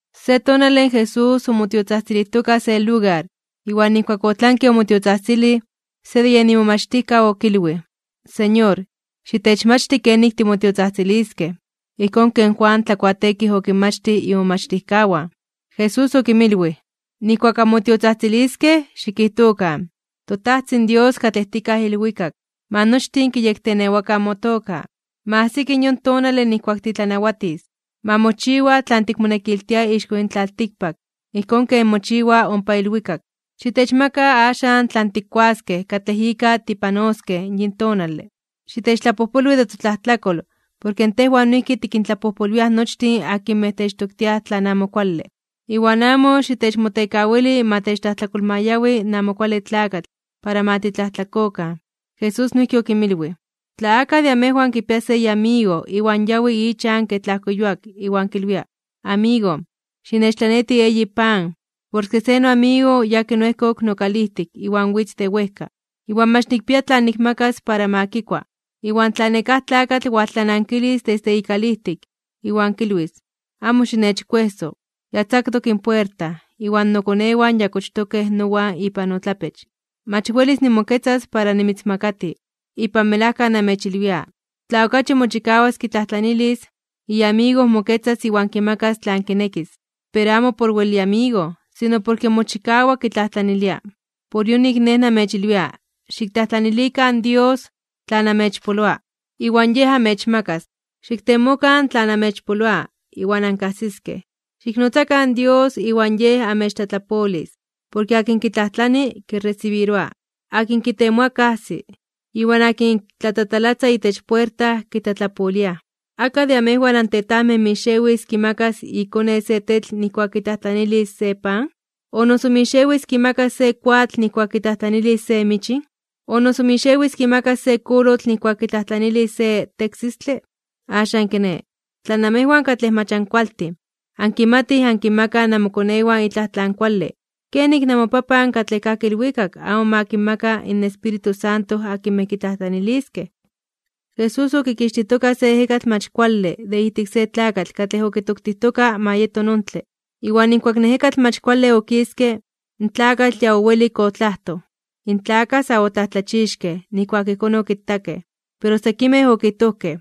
Se tonale Jesús omotiotzajtzilijtoka se lugar, iwan nijkuak otlanke omotiotzajtzilij, se de imomachtijkaw okilwij: ―Señor, xitechmachti kenik timotiotzajtziliskej, ijkón ken Juan Tlakuateekij okinmachtij imomachtijkawan. Jesús okinmilwij: ―Nijkuak anmotiotzajtziliskej, xikijtokan: ToTajtzin Dios katlej tikaj ilwikak, ma nochtin kiyektenewakan motoka. Ma ajsiki yon tonale nijkuak titlanawatis. Ma mochiwa tlan tikmonekiltia ixko yin tlaltikpak ijkón ken mochiwa ompa ilwikak. Xitechmaka axan tlan tikkuaskej katlej ika tipanoskej yin tonale. Xitechtlapojpolwi de totlajtlakol, porke tejwan noijki tikintlapojpolwiaj nochtin akinmej techtoktiaj tlan amo kuale. Iwan amo xitechmotekawili ma techtlajtlakolmayawi in Amo Kuale Tlakatl para ma titlajtlakokan. Jesús noijki okinmilwij: ―Tla akaj de amejwan kipia se iamigo iwan yawi ichan kej tlajko yuak, iwan kilwia: “Amigo, xinechtlaneti eyi pan, porke se noamigo yakin oejkok nokalijtik iwan witz de wejka, iwan mach nikpia tlan nikmakas ma kikua.” Iwan tla nekáj tlakatl waltlanankilis desde ikalijtik, iwan kilwis: “Amo xinechkuejso. Ya tzaktok in puerta, iwan nokonewan ya kochtokej nowan ipan totlapech. Mach welis nimoketzas para nimitzinmakati.” Ipan melajka namechilwia, tla okachi mochikawas kitlajtlanilis, iamigo moketzas iwan kimakas tlan kinekis, pero amo por wel iamigo, sino porke mochikawa kitlajtlanilia. Por yonik Nej namechilwia: Xiktlajtlanilikan Dios tlan amechpoloa, iwan Yej amechmakas. Xiktemokan tlan amechpoloa, iwan ankajsiskej. Xiknotzakan Dios, iwan Yej amechtlatlapolis. Porke akin kitlajtlani, kiresibiroa. Akin kitemoa, kajsi. Iwan akin tlatatalatza itech puerta, kitlatlapoliaj. ’¿Akaj de amejwan antetajmej mixewis kimakas ikone se tetl nijkuak kitlajtlanilis se pan? ¿O noso mixewis kimakas se koatl nijkuak kitlajtlanilis se michin? ¿O noso mixewis kimakas se kolotl nijkuak kitlajtlanilis se teksistle? Axan kiné, tla namejwan katlej mach ankualtin, ankimatij ankinmakaj namokonewan itlaj tlan kuale, kenik namoPapan katlej kajki ilwikak amo ma kinmaka in Espíritu Santo akinmej kitlajtlaniliskej. Jesús okikixtijtoka se ejekatl mach kuale de ijtik se tlakatl katlej okitoktijtoka ma yeto nontle. Iwan nijkuak in ejekatl mach kuale okiske, in tlakatl ya owelik otlajtoj. In tlakaj sa otlajtlachixkej (omomajmawtijkej) nijkuak ijkón okitakej, pero sekimej okijtojkej: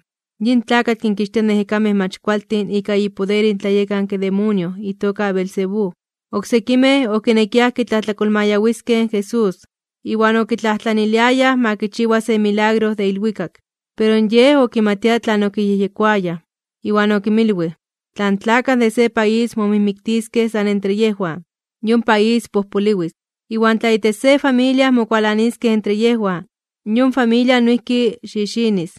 ―Yin tlakatl kinkixtia ejekamej mach kualtin ika ipoder in tlayekanke demonio itoka Beelzebú. Oksekimej, okinekiaj kitlajtlakolmayawiskej in Jesús, iwan okitlajtlaniliayaj ma kichiwa se milagro de ilwikak. Pero Yej okimatia tlan okiyejyekoayaj, iwan okinmilwij: ―Tla in tlakaj de se país momijmiktiskej san entre yejwan, yon país pojpoliwis. Iwan tla itech se familia mokualaniskej entre yejwan, yon familia noijki xixinis.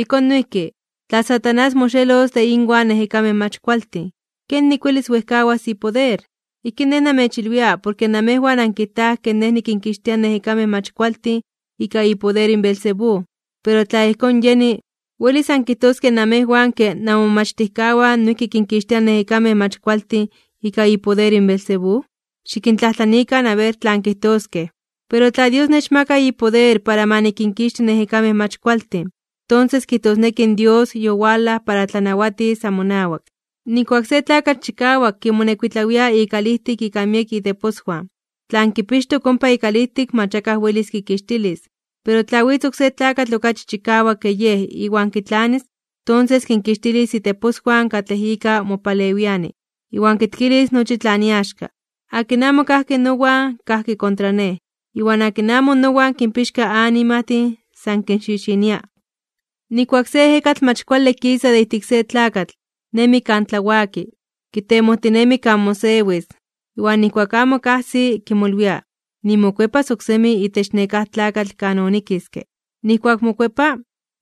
Ijkón noijki, tla Satanás moxelos de inwan ejekamej mach kualtin, ¿kenik welis wejkawas ipoder? Ijkín Nej namechilwia porke namejwan ankijtaj ke Nej nikinkixtia ejekamej mach kualtin ika ipoder in Beelzebú. Pero tla ijkón yeni, ¿welis ankijtoskej namejwan ke namomomachtijkawan noijki kinkixtiaj ejekamej mach kualtin ika ipoder in Beelzebú? Xikintlajtlanikan aber tlan kijtoskej. Pero tla Dios nechmaka ipoder para ma nikinkixti ejekamej mach kualtin, tonses kijtosneki in Dios yowalaj para tlanawatis amonawak. ’Nijkuak se tlakatl chikawak kimonekuitlawia ikalijtik ika miekej iteposwan, tlan kipixtok ompa ikalijtik mach akaj welis kikixtilis. Pero tla witz oksé tlakatl okachi chikawak ke yej iwan kitlanis, tonses kinkixtilis iteposwan katlej ika mopalewiani, iwan kitkilis nochi tlan iaxka. ’Akin amo kajki nowan, kajki kontra Nej. Iwan akin amo nowan kinpixka animajtin, san kinxixinia. ’Nijkuak se ejekatl mach kuale kisa de ijtik se tlakatl, nemi kan tlawaki, kitemojtinemi kan mosewis. Iwan nijkuak amo kajsi, kimolwia: “Nimokuepas oksemi itech nekáj tlakatl kan onikiske.” Iwan nijkuak mokuepa,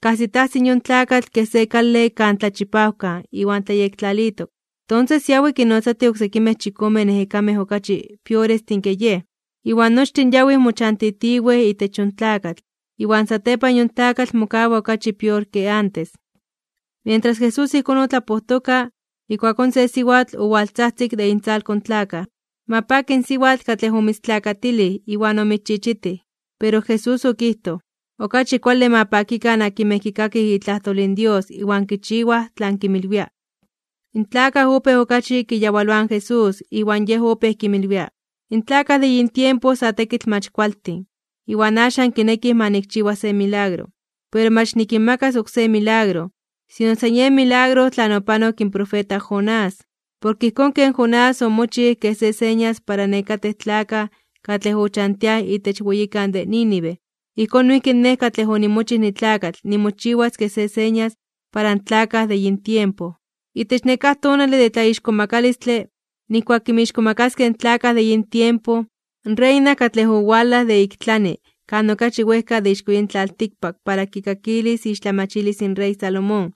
kajsitajsi in yon tlakatl kej se kale kan tlachipawkan iwan tlayektlalitok. Tonses yawi kinnotzatij oksekimej chikomen ejekamej okachi piorestin ke yej, iwan nochtin yawij mochantitiwej itech yon tlakatl, iwan satepan yon tlakatl mokawa okachi pior ke antes. Mientras Jesús ijkón otlapojtoka, ijkuakón se siwatl owaltzajtzik de intzalko in tlakaj: ―Ma paki in siwatl katlej omitztlakatilij iwan omitzchichitij. Pero Jesús okijtoj: ―Okachi kuale, ma pakikan akinmej kikakij itlajtol in Dios iwan kichiwaj tlan kinmilwia. In tlakaj opéj okachi kiyawaloaj in Jesús, iwan Yej opéj kinmilwia: ―In tlakaj de yin tiempo sa tekitl mach kualtin, iwan axan kinekij ma nikchiwa se milagro. Pero mach nikinmakas oksé milagro, sino san yen milagro tlan opanok in profeta Jonás. Porke ijkón ken Jonás omochij kej se señas para nekatej tlakaj katlej ochantiaj itech weyikan de Nínive, ijkón noijki Nej katlej onimochij nitlakatl nimochiwas kej se señas para in tlakaj de yin tiempo. Itech nekáj tonale de tlaixkomakalistle (tlatzonmanalos), nijkuak kinmixkomakaskej in tlakaj de yin tiempo, in reina katlej owalaj de ik tlani kan okachi wejka de ixko yin tlaltikpak para kikakilis iixtlamachilis in rey Salomón,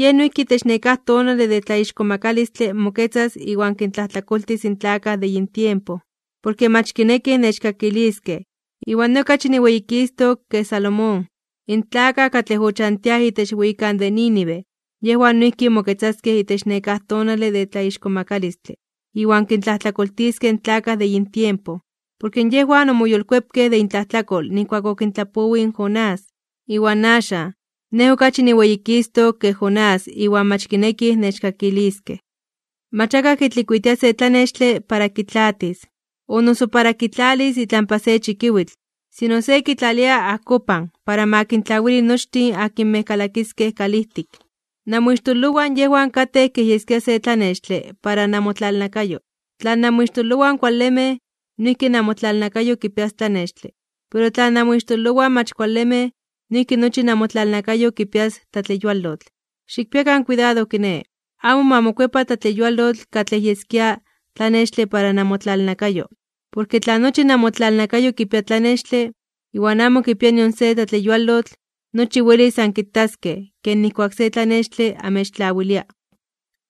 yej noijki itech nekáj tonale de tlaixkomakalistle moketzas iwan kintlajtlakoltis in tlakaj de yin tiempo, porke mach kinekij nechkakiskej, iwan Nej okachi niweyikistok (niweyititok) ke Salomón. In tlakaj katlej ochantiaj itech weyikan de Nínive, yejwan noijki moketzaskej itech nekáj tonale de tlaixkomakalistle (tlatzonmanalos) iwan kintlajtlakoltiskej in tlakaj de yin tiempo. Porke yejwan omoyolkuepkej de intlajtlakol nijkuak okintlapowij in Jonás. Iwan axan, Nej okachi niweyikistok (niweyititok) ke Jonás iwan mach kinekij nechkakiskej. ’Mach akaj kitlikuitia se tlanextle para kitlaatis, o noso para kitlalis itlampa se chikiwitl, sino se kitlalia ajkopan, para ma kintlawili nochtin akinmej kalakiskej kalijtik. Namoixtololowan yejwan katej kej yeskia se tlanextle para namotlalnakayo. Tla namoixtololowan kualemej, noijki namotlalnakayo kipias tlanextle. Pero in tla namoixtololowan mach kualemej, noijki nochi namotlalnakayo kipias tlatleyualotl. Xikpiakan kuidado kiné, amo ma mokuepa tlatleyualotl katlej yeskia tlanextle para namotlalnakayo. Porke tla nochi namotlalnakayo kipia tlanextle, iwan amo kipia nion se tlatleyualotl, nochi welis ankitaskej, ken nijkuak se tlanextle amechtlawilia.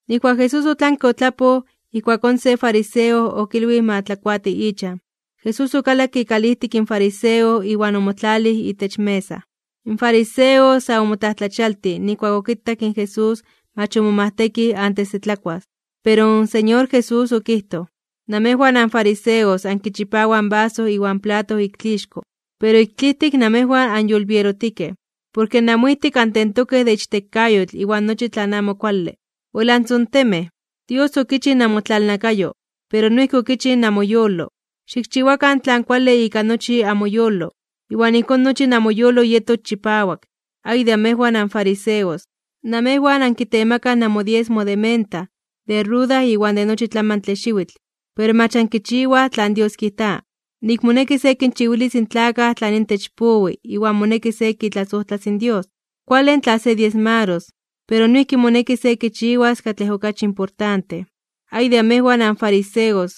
Nijkuak Jesús otlanke otlapoj, ijkuakón se fariseo okilwij ma tlakuati ichan. Jesús okalakke ikalijtik in fariseo iwan omotlalij itech mesa. In fariseo sa omotlajtlachialtij (omomajmawtij) nijkuak okitak nik in Jesús mach omomajtekij antes de tlakuas. Pero in Señor Jesús okijtoj: ―Namejwan anfariseos ankichipawaj in vaso iwan plato ik tlixko, pero ik tlijtik namejwan anyolbierotikej. Porke namoijtik antentokej de ichtekayotl iwan nochi tlan amo kuale. ¡Wel antzontemej! Dios okichij namotlalnakayo, pero noijki okichij namoyolo. Xikchiwakan tlan kuale ika nochi amoyolo, iwan ijkón nochi namoyolo yetos chipawak. ’¡Ay de amejwan, anfariseos! Namejwan ankitemakaj namodiesmo de menta, de ruda iwan de nochi tlamantle xiwitl. Pero mach ankichiwaj tlan Dios kijta, nik moneki se kinchiwilis in tlakaj tlan intech powi iwan moneki se kitlasojtlas in Dios. Kuale in tla se diesmaros, pero noijki moneki se kichiwas katlej okachi importante. ’¡Ay de amejwan, anfariseos!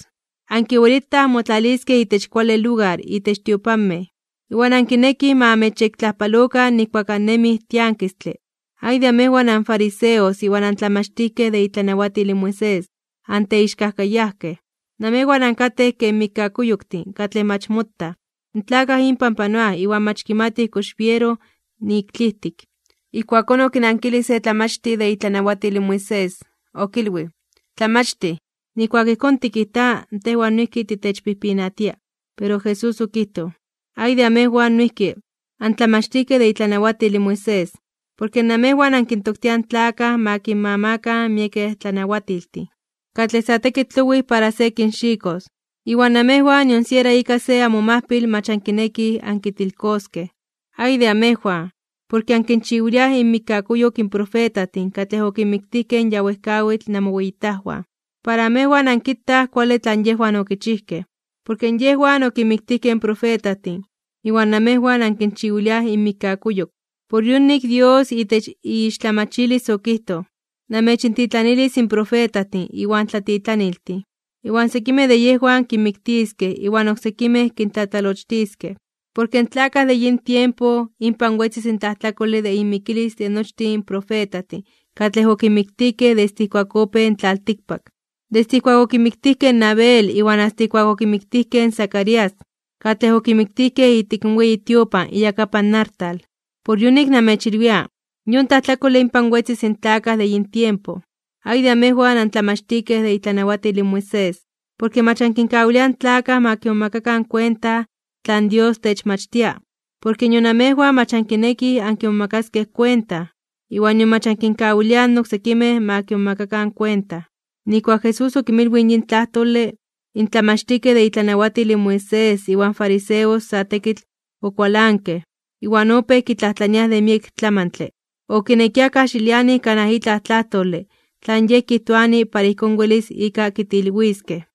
Ankiwelitaj anmotlaliskej itech kuale lugar itech tiopanmej, iwan ankinekij ma amechyektlajpalokan nijkuak annemij tiankistle. ’¡Ay de amejwan, anfariseos iwan antlamachtijkej de itlanawatil in Moisés, anteixkajkayajkej! Namejwan ankatej ken mikkakuyoktin katlej mach motaj, in tlakaj inpan panoaj iwan mach kimatij kox tlabiero nik tlijtik. Ijkuakón okinankilij se tlamachtij de itlanawatil in Moisés, okilwij: ―Tlamachtij, nijkuak ijkón tikijta, tejwan noijki titechpijpinatia. Pero Jesús okijtoj: ―¡Ay de amejwan noijki, antlamachtijkej de itlanawatil in Moisés! Porke namejwan ankintoktiaj in tlakaj ma kinmamakan miekej tlanawatiltin, katlej sa tekitl owij para se kinxikos, iwan namejwan nion siera ika se amomajpil mach ankinekij ankitilkoskej. ’¡Ay de amejwan, porke ankinchiwiliaj inmikkakuyok in profetajtin katlej okinmiktijkej in ya wejkawitl namoweyitajwan! Para amejwan ankitaj kuale tlan yejwan okichijkej. Porke yejwan okinmiktijkej in profetajtin, iwan namejwan ankinchiwiliaj inmikkakuyok. ’Por yonik Dios itech iixtlamachilis okijtoj: “Namechintitlanilis profetajtin iwan tlatitlaniltin, iwan sekimej de yejwan kinmiktiskej iwan oksekimej kintlatlalochtiskej.” Porke in tlakaj de yin tiempo, inpan wetzis in tlajtlakole de inmikilis de nochtin profetajtin katlej okinmiktijkej desde ijkuak opéj in tlaltikpak. Desde ijkuak okimiktijkej in Abel iwan asta ijkuak okimiktijkej in Zacarías, katlej okimiktijkej ijtik in weyi tiopan iyakapan artal. Por yonik namechilwia, yon tlajtlakole inpan wetzis in tlakaj de yin tiempo. ’¡Ay de amejwan, antlamachtijkej de itlanawatil in Moisés! Porke mach ankinkawiliaj in tlakaj ma kimomakakan kuenta tlan Dios techmachtia. Porke nion amejwan mach ankinekij ankimomakaskej kuenta, iwan nion mach ankinkawiliaj in oksekimej ma kimomakakan kuenta. Nijkuak Jesús okinmilwij yin tlajtole, in tlamachtijkej de itlanawatil in Moisés iwan fariseos sa tekitl okualankej, iwan opéj kitlajtlania de miek tlamantle. Okinekiaj kajxilianij kanaj itlaj tlajtole tlan Yej kijtoani para ijkón welis ika kitilwiskej.